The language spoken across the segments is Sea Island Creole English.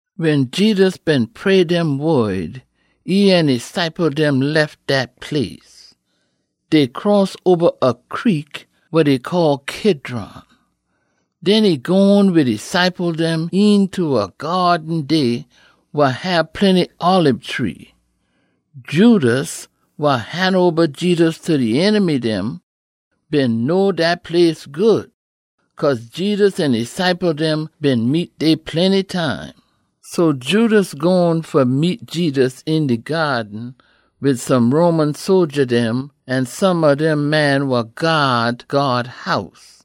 Wen Jedus been pray dem wod, e an e ciple dem lef dat place. Dey cross oba a creek wa dey call Kidron. Den e gone wid e ciple dem eenta a gyaaden dey wa hab plenty olib tree. Judas, wa han oba Jedus ta e enemy dem, been know dat place good, cause Jedus an e ciple dem been meet dey plenty time. So Judas gone fa meet Jedus een de gyaaden wid some Roman sodja dem, an some ob dem man wa gyaad God House.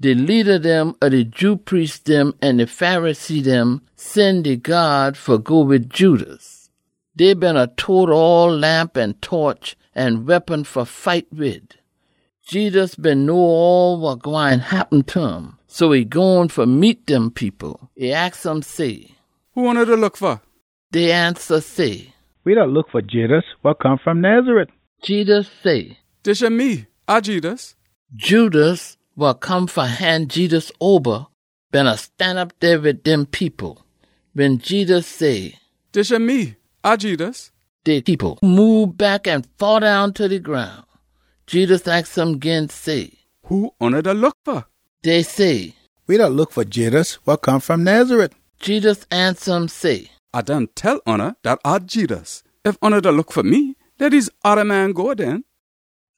De leada dem ob de Jew priest dem an de Pharisee dem sen de gyaad fa go wid Judas. Dey beena tote oll lamp an toch, an weapon fa fight wid. Jedus been know all wa gwine happen ta um, so e gone fa meet dem people. E aks um say, “Who oona da look fa?” Dey ansa say, “We da look fa Jedus wa come fom Nazareth.” Jedus say, “Dis yah me. A Jedus.” Judas, wa come fa han Jedus oba, beena stanop dey wid dem people. Wen Jedus say, “Dis yah me. A Jedus,” de people moob back an faddown ta de groun. Jedus aks um gin say, “Who oona da look fa?” Dey say, “We da look fa Jedus wa come fom Nazareth.” Jedus ansa um say, “A done tell oona dat A Jedus. Ef oona da look fa me, leh dese oda man go den.”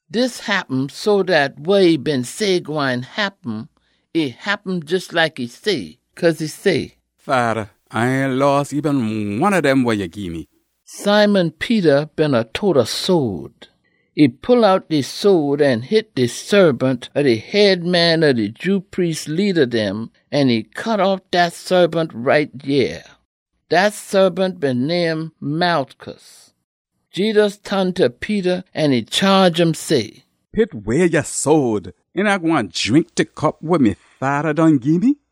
Dis happen so dat wa e been say gwine happen, e happen jes like e say. Cause e say, “Fada, A ain loss eben one ob dem wa ya gii me.” Simon Peter beena tote a sode. E pull out de sode an hit de saabant ob de head man ob de Jew priest leada dem, an e cut off dat saabant right yea. Dat saabant been name Malchus. Jedus ton ta Peter an e chaage um say, “Pit way ya sode! Ain A gwine drink de cup wa me Fada done gii me?”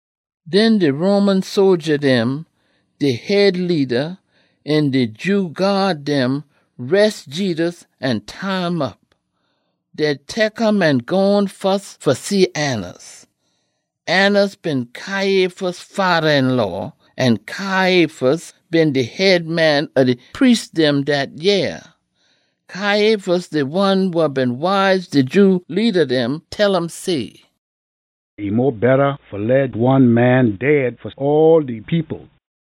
Den de Roman sodja dem, dey head leada, an de Jew gyaad dem res Jedus an tie um op. Dey tek um an gone fus fa see Annas. Annas been Caiaphas fada-een-law, an Caiaphas been de head man ob de priest dem dat yeah. Caiaphas de one wa been wise de Jew leada dem, tell um say, “E mo betta fa one man fa dead fa all de people.”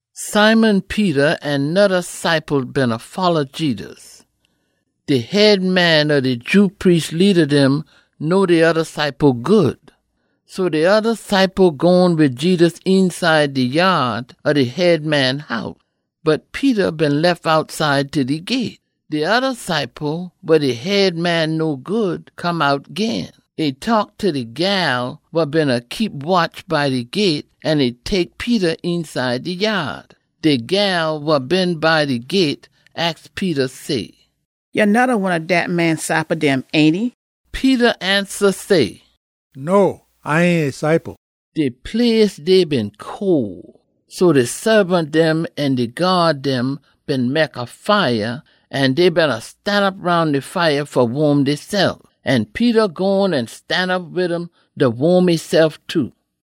Simon Peter an noda ciple beena folla Jedus. De head man ob de Jew priest leada dem know de oda ciple good. So de oda ciple gone wid Jedus eenside de yaad ob de head man house. Bot Peter been lef outside ta de gyate. De oda ciple, wa de head man know good, come out gin. E taak ta de gyal wa beena keep watch by de gyate, an e tek Peter eenside de yaad. De gyal wa been by de gyate aks Peter say, “Ya noda one ob dat man ciple dem, ainty?” Peter ansa say, “No, A ain e ciple!” De place dey been cole, so de saabant dem an de gyaad dem been mek a fire, an dey beena stanop roun de fire fa waam deysef. An Peter gone an stanop wid um da waam esef too.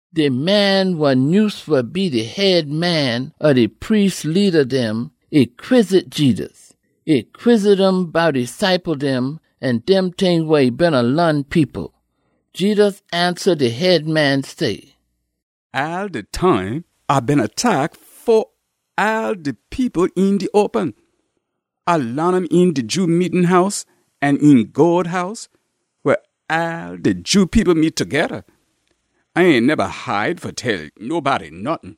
De man wa nyuse fa be de head man ob de priest leada dem, e quizzit Jedus. E quizzit um bout e ciple dem an dem ting wa e beena laan people. Jedus ansa de head man say, “All de time A beena taak fo all de people een de open. A laan um een de Jew meetin house an een God House, weh all de Jew people meet togeda. A ain neba hide fa tell nobody nottin.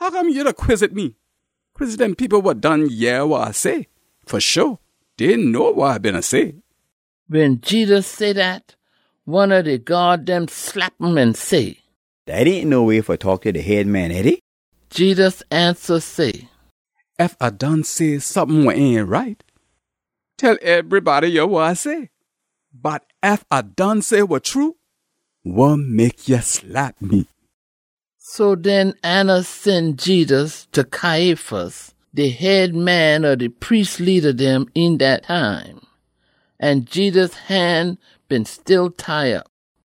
Hoccome ya da quizzit me? Quizzit dem people wa done yeh wa A say. Fa sho, dey know wa A beena say.” Wen Jedus say dat, one ob de gyaad dem slap um an say, “Dat ain no way fa taak ta de head man, ainty?” Jedus ansa say, “Ef A done say sompin wa ain right, tell ebrybody yah wa A say. Bot ef A done say wa true, wa mek ya slap me?” So den Annas sen Jedus ta Caiaphas, de head man ob de priest leada dem een dat time. An Jedus han been still tie op.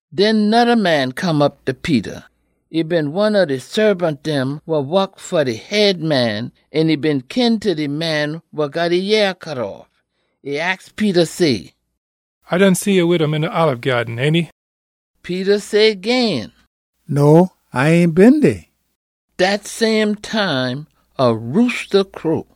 Den noda man come op ta Peter. E been one ob de saabant dem wa wok fa de head man an e been kin ta de man wa got e yea cut off. E aks Peter say, “A done see ya wid um een de olib gyaaden, ainty?” Peter say gin, “No, A ain been dey!” Dat same time, a roosta crow.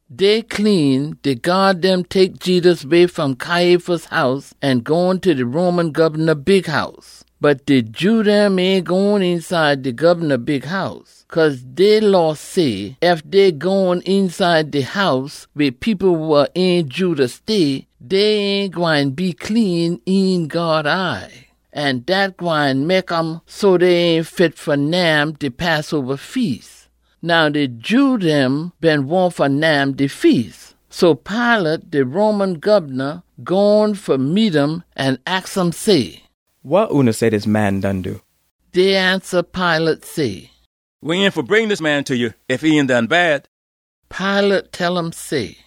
Day clean, de gyaad dem tek Jedus way fom Caiaphas house an gone ta de Roman gobna bighouse. Bot de Jew dem ain gone eenside de gobna bighouse. Cause dey Law say ef dey gone eenside de house weh people wa ain Jew da stay, dey ain gwine be clean een God eye, an dat gwine mek um so dey ain fit fa nyam de Passoba Feas. Now de Jew dem been wahn fa nyam de feas. So Pilate, de Roman gobna, gone fa meet um an aks um say, “Wa oona say dis man done do?” Dey ansa Pilate say, “We ain been fa bring dis man ta ya ef e ain done bad.” Pilate tell um say,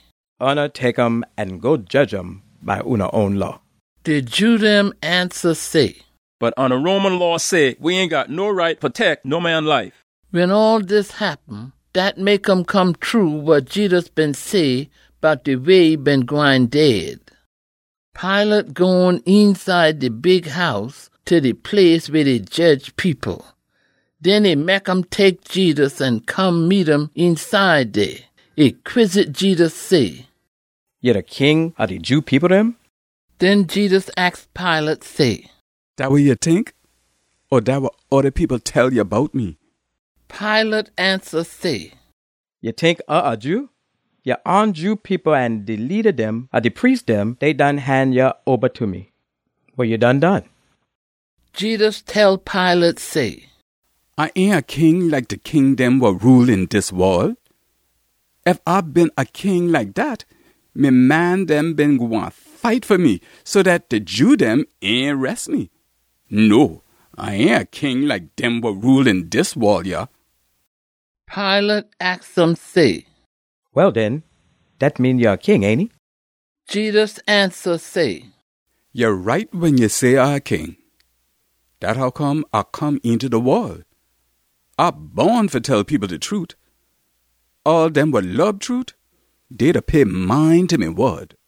“Oona tek um an go jedge um by oona own law.” De Jew dem ansa say, “Bot oona Roman law say we ain got no right fa tek no man life.” Wen all dis happen, dat mek um come true wa Jedus been say bout de way e been gwine dead. Pilate gone eenside de bighouse ta de place weh dey jedge people. Den e mek um tek Jedus an come meet um eenside dey. E quizzit Jedus say, “Ya de King ob de Jew people dem?” Den Jedus aks Pilate say, “Dat wa ya tink? O dat wa oda people tell ya bout me?” Pilate ansa say, “Ya tink A a Jew? Ya own Jew people an de leada dem ob de priest dem, dey done han ya oba ta me. Wa ya done done?” Jedus tell Pilate say, “A ain a king like de king dem wa rule een dis wol. Ef A been a king like dat, me man dem been gwine fight fa me so dat de Jew dem ain res me. No, A ain a king like dem wa rule een dis wol yah.” Pilate aks um say, “Well den, dat mean ya a king, ainty?” Jedus ansa say, “Ya right wen ya say A a king. Dat hoccome A come eenta de wol. A bon fa tell people de trute. All dem wa lob trute, dey da pay mind ta me wod.”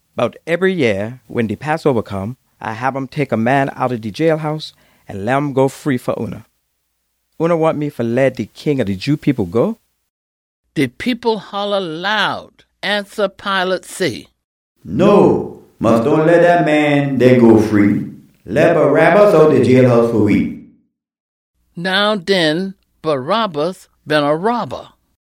Bot ebry yeah wen de Passoba come, A hab um tek a man outta de jailhouse an leh um go free fa oona. Oona wahn me fa leh de king ob de Jew people go?” De people holla loud, ansa Pilate say, “No, mus dohn leh dat man dey go free! Leh Barabbas outta de jailhouse fa we!” Now den, Barabbas been a robba.